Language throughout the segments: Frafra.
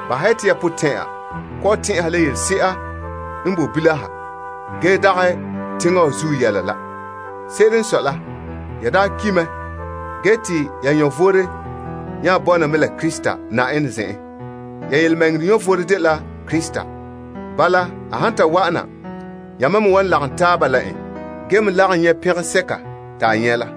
Bahɛ ya te ya potɛn'ɛra kɔ'ɔn tɛn'ɛha la yelese'a n boe bilam ha la ge dagɛ teŋa wa zuo yɛla la. Se'ere n sɔe la, ya daa ki' mɛ ge te ya vom nya bɔna mɛ la Krista Yenɛ zen'en. Ya yelemɛŋɛrɛ vom dela Krista. Bala, a han ta wa'ana, yamam me wan lagom taaba la en ge me lagom pɛngɛsɛka te a nyɛ' la.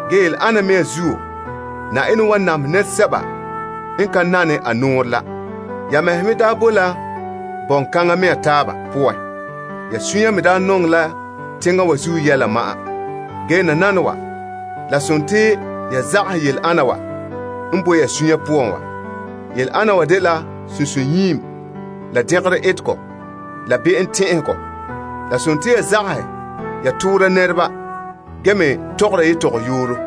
Yele ana mea zuo, Yenɛ wan namehɛ nɛresɛba n ka nane a nɔɔrɛ la. Ya mɛhe me daa bo la bɔŋkaŋa mea taaba poan. Ya suunre me daa nɔŋɛ la teŋa wa zuo yɛla ma'an. Ge nananawa, la dela ya zagahɛ yele ana wa n boe ya suunre poan wa. Yele ana wa dela sunsunyiim, la dɛngerɔ etegɔ, la be'em tɛn'ɛhegɔ. La ya zagahɛ ya toora nɛreba ge me tɔgɔra tɔgɔyooro.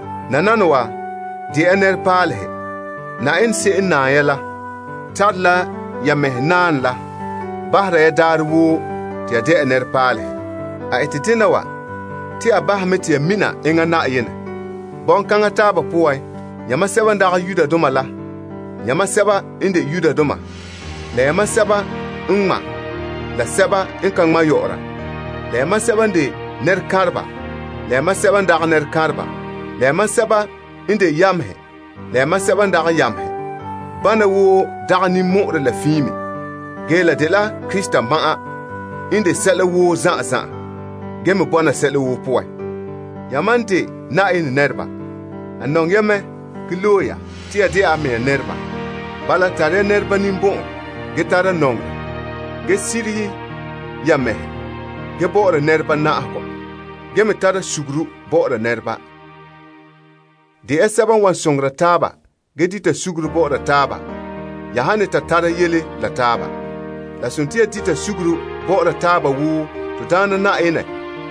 Nananawa, de ya nɛrepaalehe. Yenɛ se'em n naam ya la tare la ya mɛhe naanɛ la bahera ya daarɛ woo te ya dɛna nɛrepaalehe. A ete dena wa te a bahɛ mɛ te ya mina enŋa Yenɛ. Bɔŋkana taaba poan, yamam sɛba n de Greekdoma la yamam sɛba n de Yudoma, la yamam sɛba n ŋma' la sɛba n ka ŋma', la yamam sɛba n de nɛrekanreba la yamam sɛba n dagɛ nɛrekanreba, la yamam sɛba n de yamehe la yamam sɛba n dagɛ yamehe. Bana woo dagɛ ninmɔ'ɔrɛ la fiin me. La dela Krista ma'an n de sɛla woo zan'an zan'an, ge me bɔna sɛla woo poan. Yamam n de Yenɛ nɛreba. A nɔŋɛ ya mɛ ge loe ya te ya dɛna a mɛŋa nɛreba. Bala, tara nɛreba ninbɔn'ɔn, ge tara nɔŋerɛ, ge sirihe ya mɛhe, ge bɔ'ɔra nɛreba na'ahegɔ, ge me tara sugure bɔ'ɔra nɛreba. De ya sɛba n wan soŋora taaba ge dita sugure bɔ'ɔra taaba ya han ne ta tara yele la taaba. La dela ya dita sugure bɔ'ɔra taaba wo Na'ayenɛ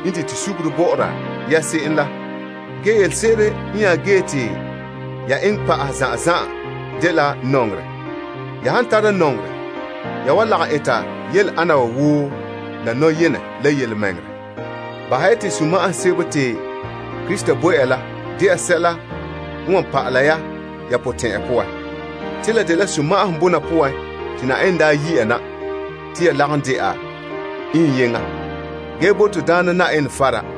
n dite sugure bɔ'ɔra ya se'em la. Ge yelese'ere n nya ge te ya eŋɛ pa'ahɛ zan'an zan'an dela nɔŋerɛ. Ya han tara nɔŋerɛ, ya wan lagom eta yele ana wa woo la nɔyenɛ la. Bahɛ ya te sunma'ahom sebo te Krista bo ya la sɛla n wan pa'ala ya ya potɛn'ɛra poan. Te la dela sunma'ahom bɔna poan te Yenɛ daa yi' ya na te ya lagom dɛna iŋyeŋɔ. Ge bo Yenɛ fara.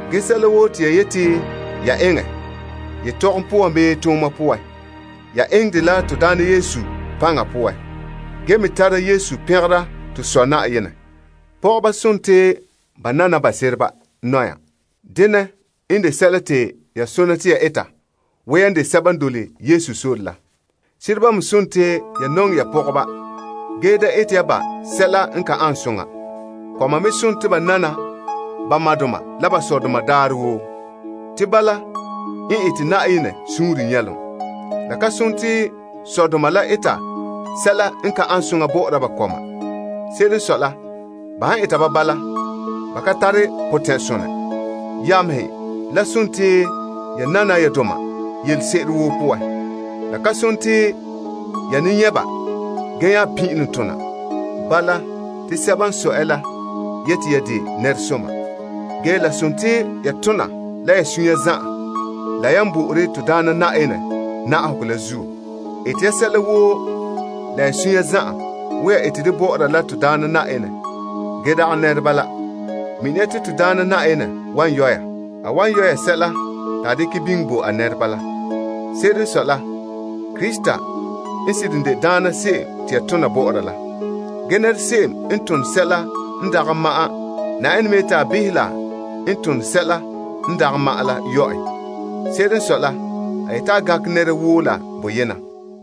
Ge sɛla woo te ya yete ya eŋɛ yetɔgom poan bii tooma poan, ya eŋɛ dɛ la Na'ayenɛ Yesu paŋa poan. Ge yamam me tara Yesu pɛngera to Sɔ Yenɛ. Pɔgɔba, nana ba sereba nɔya. Denɛ n de sɛla te ya sona te ya eta wo yan de sɛba n dole Yesu sore la. Sereba me nɔŋɛ ya pɔgɔba ge da ete ya ba sɛla n ka ane soŋa. Kɔma me nana ba dɔgɔreba daarɛ woo, te bala n ete Na'ayenɛ suunre nyɛlom. La ka sone te sɔdoma la eta sɛla n ka ane soŋa bɔ'ɔra ba kɔma. Se'ere n sɔe la, ba han eta ba bala, ba kan tara potɛn'sonɛ. Yamehe, la nana ya doma yelese'ere woo poan. La ka sone te ya ne nyɛ' ba gee nya pin'ilom tona. Bala, te sɛba n sɔe ya la yete ya de nɛresomdoma. Ge la tona la ya suunre zan'an la yan bo'ore Na'ayenɛ na'ahegɔ la zuo. Eta ya sɛla woo la ya suunre zan'an wo ya ete dɛ bɔ'ɔra la Na'ayenɛ ge dagɛ nɛreba la. Mina ya te Na'ayenɛ wan yɔ' ya. A wan yɔ' ya sɛla te a dekɛ biŋe bo a nɛreba la. Se'ere n sɔe la, Krista n seren de Na'ayenɛ se'em te ya tona bɔ'ɔra la. Ge se'em n tone sɛla n dagɛ ma'an, Yenɛ me yete a behɛ la n tone sɛla n dagɛ ma'an la yɔ' en. Se'ere n sɔe la, a yete a gankɛ nɛra woo la boyena.